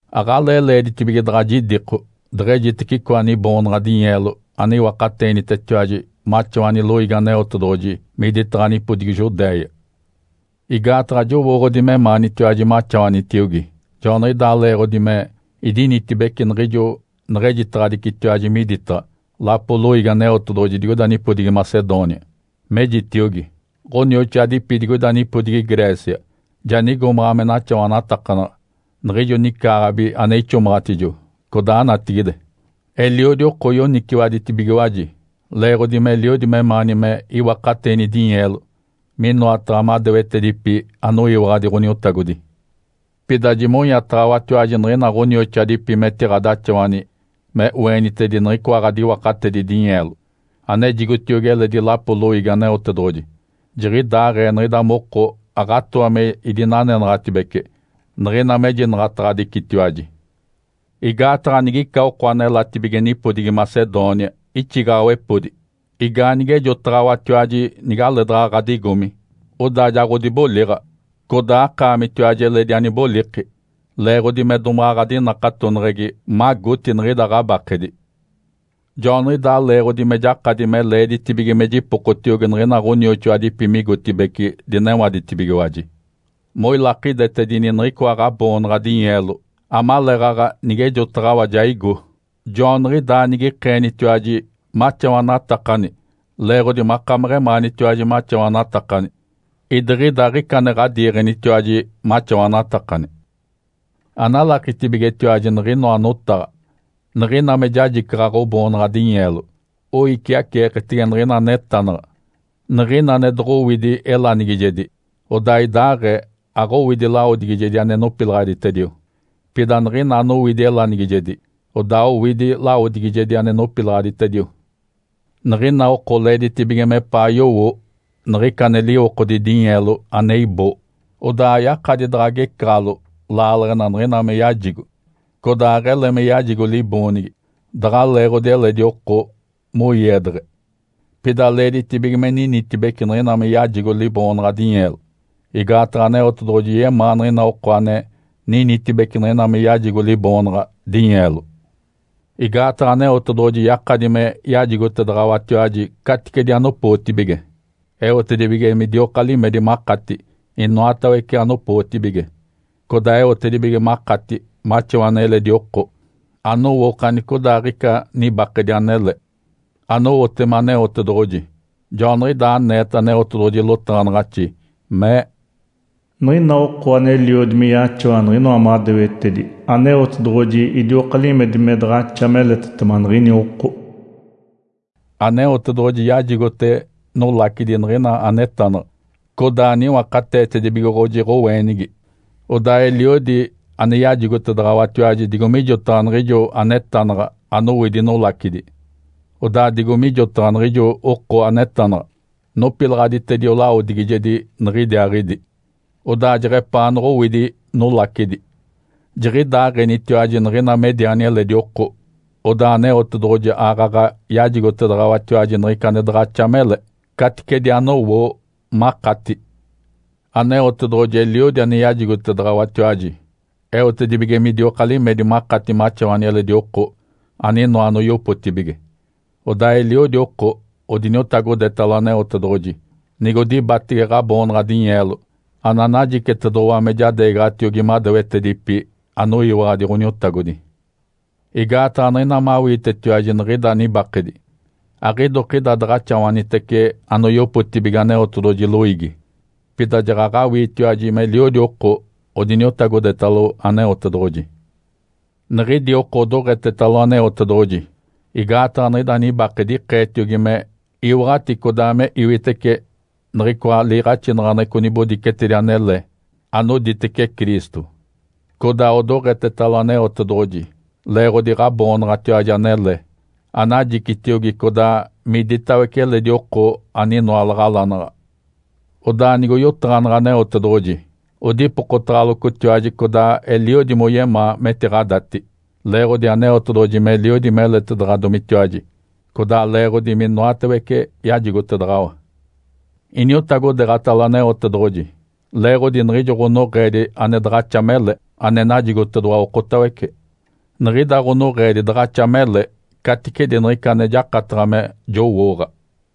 Aɡ̶alee leeditibige daɡ̶a jidiko deɡ̶ejitece icoa niboonaɡ̶a dinyeelo ane iwakateenitetiwaji maxawani loiigi Aneotedoɡ̶oji miditaɡ̶a nipodigi Judéia. Igaataɡ̶a jowooɡ̶odi memaanitiwaji maxawanitiogi. Joaniɡ̶idaa leeɡ̶odi me idinanetibece niɡ̶ijo neɡ̶ejitaɡ̶adicitiwaji miditaɡ̶a lapoli loiigi Aneotedoɡ̶oji digoida nipodigi Macedônia. Mejitiogi, “Ǥonioxoadipi digoida nipodigi Grécia ja nigomaɡ̶a me naxawanatakanaɡ̶a niɡ̶ijo nicaaɡ̶abi ane ixomaɡ̶atijo codaa natigide.” Eliodi oko yoniciwaditibigiwaji leeɡ̶odi meliodi memaani me iwakateeni dinyeelo minoataɡ̶a madewetedipi anoyiwaɡ̶adi Ǥoniotagodi. Pida jimonyataɡ̶awatiwaji niɡ̶ina ɡ̶onioxoadipi metiɡ̶adaxawani me oenitedini niɡ̶icoa ɡ̶adiwakatedi dinyeelo, anejitiogi eletidi lapoli loiigi Aneotedoɡ̶oji. Jiɡ̶idaaɡ̶ee niɡ̶ida moko aɡ̶atooa me idinanenaɡ̶atibece niɡ̶ina mejinaɡ̶ataɡ̶adicitiwaji. Igaataɡ̶a nigica oko anelatibige nipodigi Macedônia ixigaɡ̶awepodi, igaanige ejoɡ̶otaɡ̶awatiwaji nigaleedaɡ̶a ɡ̶adigomi, odaa ja ɡ̶odiboliɡ̶a, codaa akaamitiwaji eledi aniboliki, leeɡ̶odi me domaɡ̶a ɡ̶adinakatoneɡ̶egi magoti niɡ̶ida ɡ̶abakedi. Joaniɡ̶idaa leeɡ̶odi me jakadi me leeditibige me jipokotiogi niɡ̶ina ɡ̶onioxoadipi migotibeci dinewadetibigiwaji, moilakidetedini niɡ̶icoa ɡ̶aboonaɡ̶a dinyeelo amaleeɡ̶aɡ̶a nigejotaɡ̶awa ja igo. Joaniɡ̶idaa nigikeenitiwaji maxawanatakani leeɡ̶odi makameɡ̶emaanitiwaji maxawanatakani, idiɡ̶ida aɡ̶ica ane ɡ̶adiiɡ̶enitiwaji maxawanatakani. Analakitibigetiwaji niɡ̶inoa notaɡ̶a! Niɡ̶ina me jajicaɡ̶a ɡ̶oboonaɡ̶a dinyeelo oiciaceeketege niɡ̶ina anetanaɡ̶a. Niɡ̶ina ane doɡ̶owidi elanigijedi, odaa idaaɡ̶ee aɡ̶owidi lawodigijedi ane nopilaɡ̶aditedio. Pida niɡ̶ina anowidi elanigijedi, odaa owidi lawodigijedi ane nopilaɡ̶aditedio. Niɡ̶ina oko leeditibige mepaa yowo niɡ̶ica ane liwokodi dinyeelo me ane iboo. Odaa ayakadi daɡ̶a agecaɡ̶alo laaleɡ̶ena niɡ̶ina me yajigo, codaa aɡ̶ele me yajigo liboonigi daɡ̶a leeɡ̶odi eledi oko moiedeɡ̶e. Pida leeditibige me ninitibece niɡ̶ina me yajigo liboonaɡ̶a dinyeelo, igaataɡ̶a Aneotedoɡ̶oji yemaa niɡ̶ina oko ane ninitibece niɡ̶ina me yajigo liboonaɡ̶a dinyeelo. Igaataɡ̶a Aneotedoɡ̶oji yakadi me yajigotedaɡ̶awatiwaji caticedi anopootibige, eotedibige midioka limedi makati inoatawece anopootibige, codaa eotedibige makati maxawani eledi oko anowo okanicodaaɡ̶ica nibakedi anele, anowotema Aneotedoɡ̶oji. Joaniɡ̶idaa aneeta Aneotedoɡ̶oji lotaɡ̶anaɡ̶axi mee, “Niɡ̶ina oko aneliodi me yaxawa niɡ̶inoa madewetedi, Aneotedoɡ̶oji idioka limedi me daɡ̶axa meletetema niɡ̶ini oko.” Aneotedoɡ̶oji yajigote nolacidi niɡ̶ina anetanaɡ̶a, codaa niwakateetedibigoɡ̶oji ɡ̶oweenigi. Odaa eliodi ane yajigotedaɡ̶awatiwaji digo mijotaɡ̶a niɡ̶ijo anetanaɡ̶a anowidi nolacidi. Odaa digo mijotaɡ̶a niɡ̶ijo oko anetanaɡ̶a nopilaɡ̶aditedio lawodigijedi nigidiaaɡ̶idi, odaa jeɡ̶epaanaɡ̶a owidi nolacidi. Jiɡ̶idaaɡ̶enitiwaji niɡ̶ina mediani eledi oko, odaa Aneotedoɡ̶oji aaɡ̶aɡ̶a yajigotedaɡ̶awatiwaji niɡ̶ica ane daɡ̶axa mele, caticedi anowoo makati. Aneotedoɡ̶oji eliodi ane yajigotedaɡ̶awatiwaji eotedibige midioka limedi makati maxawani eledi oko aninoa anoyopotibige. Odaa eliodi oko odiniotagodetalo Aneotedoɡ̶oji nigodibatege ɡ̶aboonaɡ̶a dinyeelo ananajicitedoɡ̶owa me jadeegaɡ̶atiogi madewetedipi anoyiwaɡ̶adi Ǥoniotagodi. Igaataɡ̶a niɡ̶ina mawiitetiwaji niɡ̶ida nibakedi, aɡ̶idokida daɡ̶axawanitece anoyopotibige Aneotedoɡ̶oji loiigi, pida jaɡ̶aɡ̶awiitiwaji meliodi oko odiniotagodetalo Aneotedoɡ̶oji. Niɡ̶idi oko odoɡ̶etetalo Aneotedoɡ̶oji igaataɡ̶a niɡ̶ida nibakedi ikeetiogi me iwaɡ̶ati codaa me iwitece niɡ̶icoa liiɡ̶axinaɡ̶aneɡ̶eco nibodicetedi anele anoditece Cristo. Codaa odoɡ̶etetalo Aneotedoɡ̶oji leeɡ̶odi ɡ̶aboonaɡ̶atiwaji anele anajicitiogi codaa miditawece eledi oko aninoa laɡ̶alanaɡ̶a. Odaa nigoyotaɡ̶aneɡ̶e Aneotedoɡ̶oji, odipokotaɡ̶alocotiwaji codaa eliodi moyemaa metiɡ̶adati, leeɡ̶odi Aneotedoɡ̶oji meliodi meletedaɡ̶adomitiwaji, codaa leeɡ̶odi minoatawece yajigotedaɡ̶awa. Iniotagodeeɡ̶atalo Aneotedoɡ̶oji leeɡ̶odi niɡ̶ijo ɡ̶onoɡ̶eedi ane daɡ̶axa mele ane najigotedoɡ̶owa okotawece. Niɡ̶ida ɡ̶onoɡ̶eedi daɡ̶axa mele caticedi niɡ̶ica ane jakataɡ̶a me jowooɡ̶a.